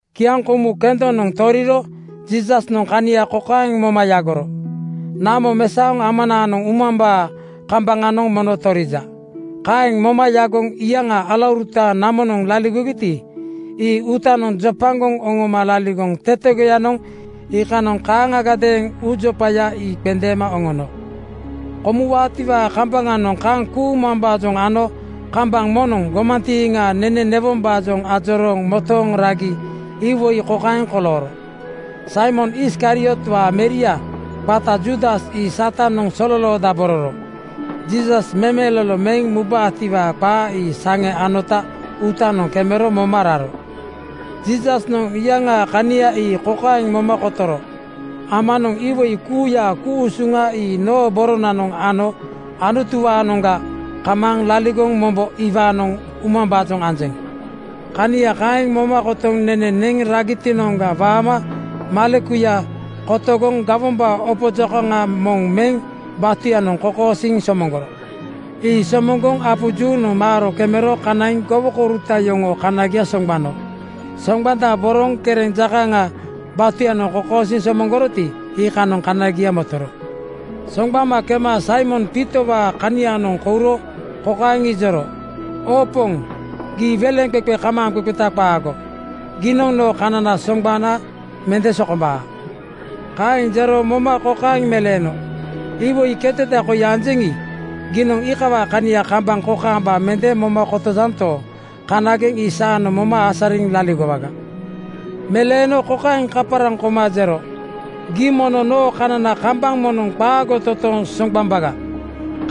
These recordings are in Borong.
Kiaŋkomu kendonoŋ toriro Jiisasnoŋ kania kokaeŋ moma yagoro, ‘Namo mesaoŋ Amanaanoŋ umambaa kambaŋanoŋ mono torija.’ Kaeŋ moma yagoŋ iyaŋaa alauruta namonoŋ laligogiti, ii uutanoŋ jopagoŋ oŋoma laligoŋ tetegoyanoŋ iikanoŋ kaaŋagadeeŋ uujopaya ii qendeema oŋono. Komuwaatiwaa kambaŋanoŋ kaŋ kuumambaajoŋ ano kambaŋ moŋnoŋ gomantiiŋaa nene newombaajoŋ ajorooŋ motooŋ ragi iwoi kokaeŋ kolooro: Saimon Iskariotwaa meria qata Juudas ii Satanoŋ sololoodabororo. Jiisas memelolo meŋ mubaatiwaa qaaya ii saŋe anota uutanoŋ kemero moma raro. Jiisasnoŋ iyaŋaa kania ii kokaeŋ moma kotoro, ‘Amanoŋ iwoi kuuyaa ku-usuŋa ii noo boronanoŋ ano Anutuwaanoŋga kamaaŋ laligoŋ mombo iwaanoŋ umambaajoŋ anjeŋ.’ Kania kaeŋ moma kotoŋ nene neŋ ragitinoŋga waama malekuya kotogoŋ gawombaa opo jokaŋa moŋ meŋ batuyanoŋ kokosiiŋ somoŋgoro. Ii somoŋgoŋ apu juunoŋ molaaro kemero kanaiŋ gowokouruta yoŋoo kanagia soŋgbano. Soŋgbandaboroŋ kereŋ jokaŋa (selemooto) batuyanoŋ kokosiiŋ somoŋgoroti, iikanoŋ kanagia motoro. Soŋgbama kema Saimon Piitowaa kanianoŋ kouro kokaeŋ ijoro, “Oo Poŋ gii weleŋqeqe kamaaŋqeqeta qaago. Giinoŋ noo kanana soŋgbana mende sokombaa.” Kaeŋ jero moma kokaeŋ meleeno, “Iwoi keteda koi anjeŋi, giinoŋ iikawaa kania kambaŋ kokaamba mende moma kotojanto, kanagenoŋ ii saanoŋ moma asariŋ laligowaga.” Meleeno kokaeŋ kaparaŋ koma jero, “Gii mono noo kanana kambaŋ moŋnoŋ qaago totooŋ soŋgbambaga.”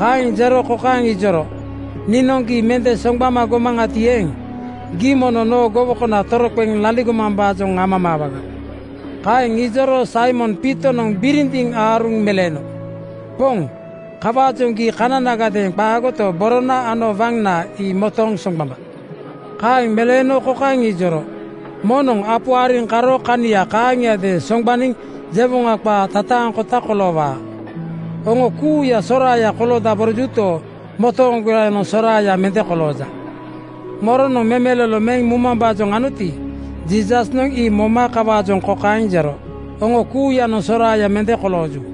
Kaeŋ jero kokaeŋ ijoro, “Niinoŋ gii mende soŋgbama gomaŋati eeŋ, gii mono noo gowokona toroqeŋ laligomambaajoŋ amamaawaga.” Kaeŋ ijoro Saimon Piitonoŋ birindiŋ aaruŋ meleeno, “Poŋ, kawaajoŋ gii kananagadeeŋ qaagoto, borona ano waŋna ii motooŋ soŋgbamba.” Kaeŋ meleeno kokaeŋ ijoro, “Moŋnoŋ apu ariŋ karo kania kaaŋiadeeŋ soŋgbaniŋ jewoŋa qaa tataaŋkota koloowaa. Oŋo kuuya soraaya koloodaborojuto, motooŋgoyanoŋ soraaya mende kolooja.” Moronoŋ memelolo meŋ mumambaajoŋ anoti, Jiisasnoŋ ii moma kawaajoŋ kokaeŋ jero, “Oŋo kuuya soraaya mende kolooju.”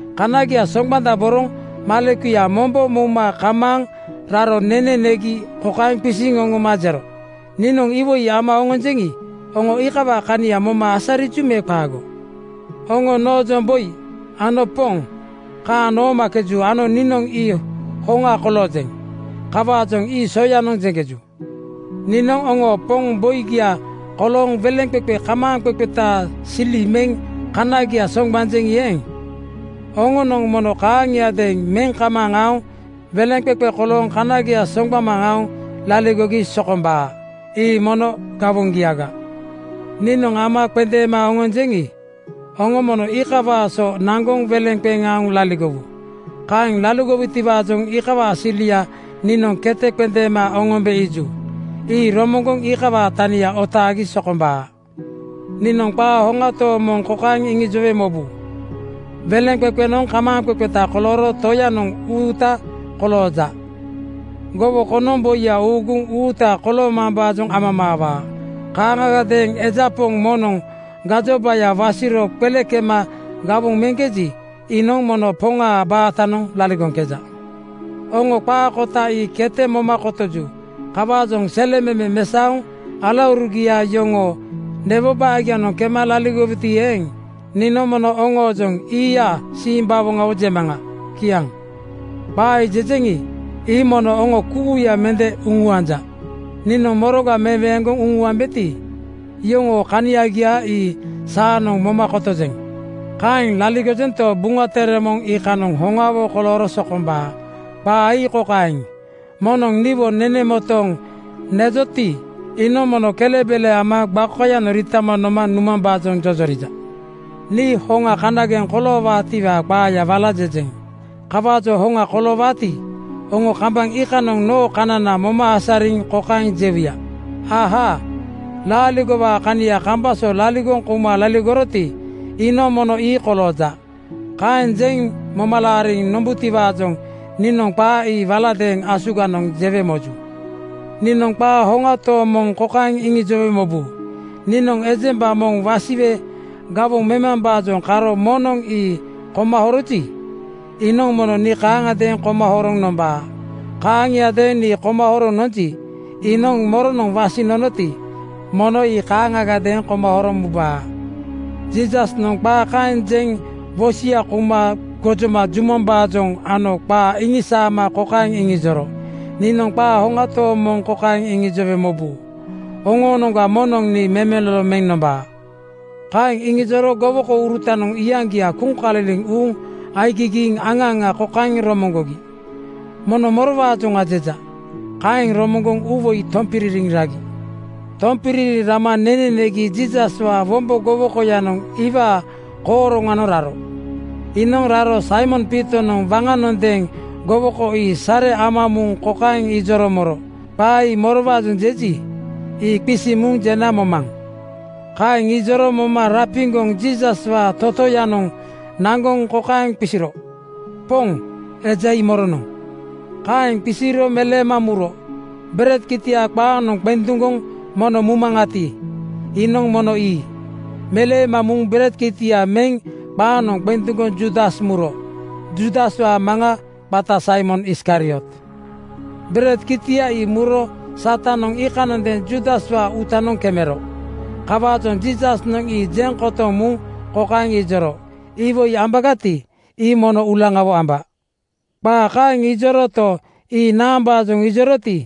Kanagia soŋgbandaboroŋ malekuya mombo mouma kamaaŋ raro nene negi kokaeŋ qisiŋ oŋoma jero, “Niinoŋ iwoi ama oŋonjeŋi, oŋo iikawaa kania moma asariju me qaago? Oŋo noojoŋ ‘Boi!’ ano ‘Poŋ!’ kaaŋ noomakeju ano niinoŋ ii hoŋa koloojeŋ. Kawaajoŋ ii soyanoŋ jeŋkeju. Niinoŋ oŋoo Poŋ Boigia kolooŋ weleŋqeqe kamaaŋqeqetaa sili meŋ kanagia soŋgbanjeŋi eeŋ, oŋonoŋ mono kaaŋiadeeŋ meŋ kamaaŋ aoŋ weleŋqeqe kolooŋ kanagia soŋgbama aoŋ laligogi sokombaa. Ii mono gawoŋgiaga. “Niinoŋ ama qendeema oŋonjeŋi, oŋo mono iikawaa so naŋgoŋ weleŋ qeŋ aoŋ laligowu. Kaeŋ laligowutiwaajoŋ iikawaa silia niinoŋ kete qendeema oŋombe iiju. Ii romoŋgoŋ iikawaa tania otaagi sokombaa. Niinoŋ qaa hoŋa tooŋ moŋ kokaeŋ iŋijowe mobu: Weleŋqeqenoŋ kamaaŋqeqeta kolooro toyanoŋ uuta kolooja. Gowokonoŋ boiya uuguŋ uuta koloomambaajoŋ amamaawaa. Kaaŋagadeeŋ eja poŋ moŋnoŋ gajobaya wasiro qele kema gawoŋ meŋkeji, iinoŋ mono poŋaa baatanoŋ laligoŋkeja. Oŋo qaa kota ii kete moma kotoju. Kawaajoŋ selememe mesaoŋ alaurugia yoŋoo newo baagianoŋ kema laligowuti eeŋ, niinoŋ mono oŋoojoŋ ‘Iia simbawoŋawo!’ jemaŋa.” Kiaŋ. “Qaa jejeŋi, ii mono oŋo kuuya mende uŋuanja. Niinoŋ moroga meweeŋgoŋ uŋuambeti, yoŋoo kaniagia ii saanoŋ moma kotojeŋ. Kaeŋ laligojento, Buŋa Tere moŋ iikanoŋ hoŋawo kolooro sokombaa. Qaa ii kokaeŋ, ‘Moŋnoŋ niwo nene motooŋ nejoti, iinoŋ mono kelebele ama gbakoyanoŋ riitama noma numambaajoŋ jojorija.’ “Nii hoŋa kanageŋ koloowaatiwaa qaayaga wala jejeŋ. Kawaajoŋ hoŋa koloowaati, oŋo kambaŋ iikanoŋ noo kanana moma asariŋ kokaeŋ jewuya, ‘Ahaa! Laaligowaa kania kambaŋ so laligoŋ kouma laligoroti, iinoŋ mono ii kolooja.’ Kaeŋ jeŋ moma laariŋ nombutiwaajoŋ niinoŋ qaa ii waladeeŋ asuganoŋ jewe moju. “Niinoŋ qaa hoŋa tooŋ moŋ kokaeŋ iŋijowe mobu: Niinoŋ ejemba moŋ wasiwe gawoŋ memambaajoŋ karo moŋnoŋ ii koma horoji, iinoŋ mono nii kaaŋiadeeŋ koma horoŋ nombaa. Kaaŋiadeeŋ nii koma horoŋ nonji, iinoŋ moronoŋ wasiŋ nonoti, mono ii kaaŋagadeeŋ koma horoŋ mubaa.” Jiisasnoŋ qaa kaeŋ jeŋ wosia kouma gojoma jumambaajoŋ ano qaa iŋisaama kokaeŋ iŋijoro, “Niinoŋ qaa hoŋa tooŋ moŋ kokaeŋ iŋijowe mobu: Oŋoonoŋga moŋnoŋ nii memelolo meŋ nombaa.” Kaeŋ iŋijoro gowokourutanoŋ iyaŋgia kuŋkaliliŋ uuŋ aigigiiŋ aŋa aŋa kokaeŋ romoŋgogi, ‘Mono morowaajoŋa jeja?’ Kaeŋ romoŋgoŋ uuwoi tompiririŋ ragi. Tompiririŋ rama nene negi Jiisaswaa wombo gowokoyanoŋ iwaa kooroŋanoŋ raro. Iinoŋ raro Saimon Piitonoŋ waŋanondeeŋ gowoko ii sare ama muŋ kokaeŋ ijoro moro, “Qaa ii morowaajoŋ jeji, ii qisiŋ muŋ jena momaŋ.” Kaeŋ ijoro moma rapiŋgoŋ Jiisaswaa totoyanoŋ naŋgoŋ kokaeŋ qisiro, “Poŋ, eja ii moronoŋ?” Kaeŋ qisiro meleema muro, “Bered kitia qaaŋnoŋ qenduŋgoŋ moŋ mumaŋati, iinoŋ mono ii.” Meleema muŋ bered kitia meŋ qaaŋnoŋ qenduŋgoŋ Juudas muro. Juudaswaa maŋa qata Saimon Iskariot. Bered kitia ii muro Satanoŋ iikanondeeŋ Juudaswaa uutanoŋ kemero. Kawaajoŋ Jiisasnoŋ ii jeŋ kotoŋ muŋ kokaeŋ ijoro, “Iwoi ambagati, ii mono uulaŋawo amba.” Qaa kaeŋ ijoroto, ii naambaajoŋ ijoroti,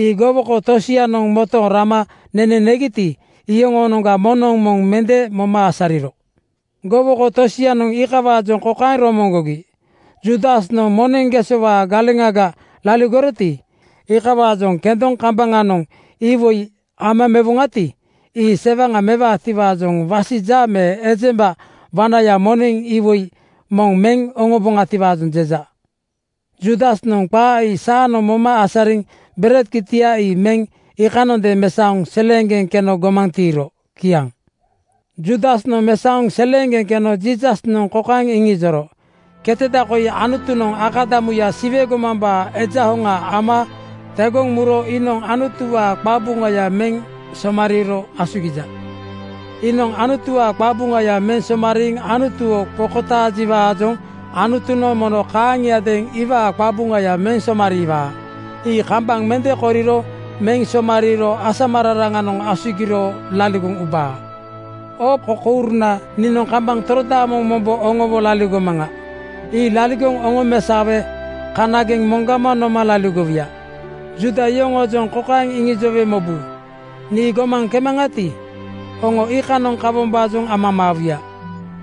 ii gowoko tosianoŋ motooŋ rama nene negiti, iyoŋoonoŋga moŋnoŋ moŋ mende moma asariro. Gowoko tosianoŋ iikawaajoŋ kokaeŋ romoŋgogi, “Juudasnoŋ moneŋ gesowaa galeŋaga laligoroti, iikawaajoŋ kendoŋ kambaŋanoŋ iwoi amamaawoŋati, ii sewaŋa mewaatiwaajoŋ wasija me ejemba wanaya moneŋ iwoi moŋ meŋ oŋombaatiwaajoŋ jeja.” Juudasnoŋ qaa ii saanoŋ moma asariŋ bered kitia ii meŋ iikanondeeŋ mesaoŋ seleeŋgeŋ keno gomaŋ tiiro. Kiaŋ. Juudasnoŋ mesaoŋ seleeŋgeŋ keno Jiisasnoŋ kokaeŋ iŋijoro, “Keteda koi Anutunoŋ akadamuya Siwe gomambaa Eja Hoŋa ama tegoŋ muro iinoŋ Anutuwaa qabuŋaya meŋ somariiro asugija. Iinoŋ Anutuwaa qabuŋaya meŋ somariiŋ Anutuwo qokotaaji-waajoŋ Anutunoŋ mono kaaŋiadeeŋ iwaa qabuŋaya meŋ somariiwaa. Ii kambaŋ mende koriro meŋ somariiro asamararaŋanoŋ asugiro laligoŋ ubaa. “Oo kokouruna, niinoŋ kambaŋ torodaamoŋ mombo oŋowo laligomaŋa. Ii laligoŋ oŋomesaowe kanageŋ moŋgama noma laligowuya. Juuda yoŋoojoŋ kokaeŋ iŋijowe mobu, ‘Nii gomaŋ kemaŋati, oŋo iikanoŋ kawombaajoŋ amamaawuya.’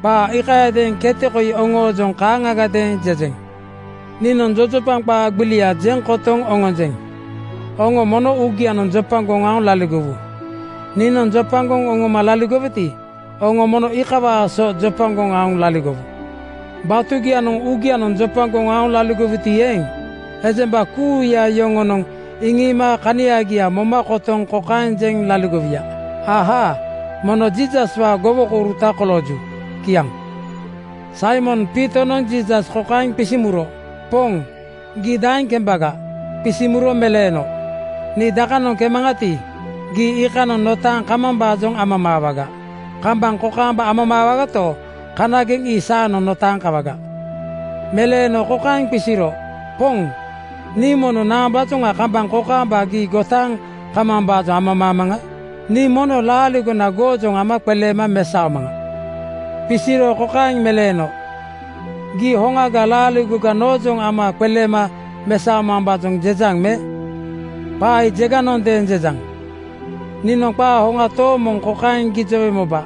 Qaa iikayadeeŋ keteda koi oŋoojoŋ kaaŋagadeeŋ jejeŋ. “Niinoŋ jojopaŋ qaa gbilia jeŋ kotoŋ oŋonjeŋ: Oŋo mono uugianoŋ jopagoŋ aoŋ laligowu. Niinoŋ jopagoŋ oŋoma laligoweti, oŋo mono iikawaa so jopagoŋ aoŋ laligowu. Batugianoŋ uugianoŋ jopagoŋ aoŋ laligowuti eeŋ, ejemba kuuya yoŋonoŋ iŋiima kaniagia moma kotoŋ kokaeŋ jeŋ laligowuya, ‘Ahaa! Mono Jiisaswaa gowokouruta kolooju.’” Kiaŋ. Saimon Piitonoŋ Jiisas kokaeŋ qisiŋ muro, “Poŋ, gii daeŋ kembaga?” Qisiŋ muro meleeno, “Nii dakanoŋ kemaŋati, gii iikanoŋ notaaŋ kamambaajoŋ amamaawaga. Kambaŋ kokaamba amamaawagato, kanageŋ ii saanoŋ notaaŋ kawaga.” Meleeno kokaeŋ qisiro, “Poŋ, nii mono naambaajoŋ kambaŋ kokaamba gii gotaaŋ kamambaajoŋ amamaamaŋa? Niinoŋ mono laaligona goojoŋ ama qeleema mesaomaŋa.” Qisiro kokaeŋ meleeno, “Gii hoŋaga laaligoga noojoŋ ama qeleema mesaomambaajoŋ jejaŋ me? Qaa ii jeganondeeŋ jejaŋ. Niinoŋ qaa hoŋa tooŋ moŋ kokaeŋ gijowe moba: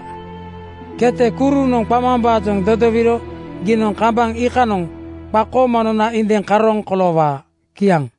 Kete kurunoŋ qamambaajoŋ dodowiro giinoŋ kambaŋ iikanoŋ qakooma nona indiŋa karooŋ koloowaa.” Kiaŋ.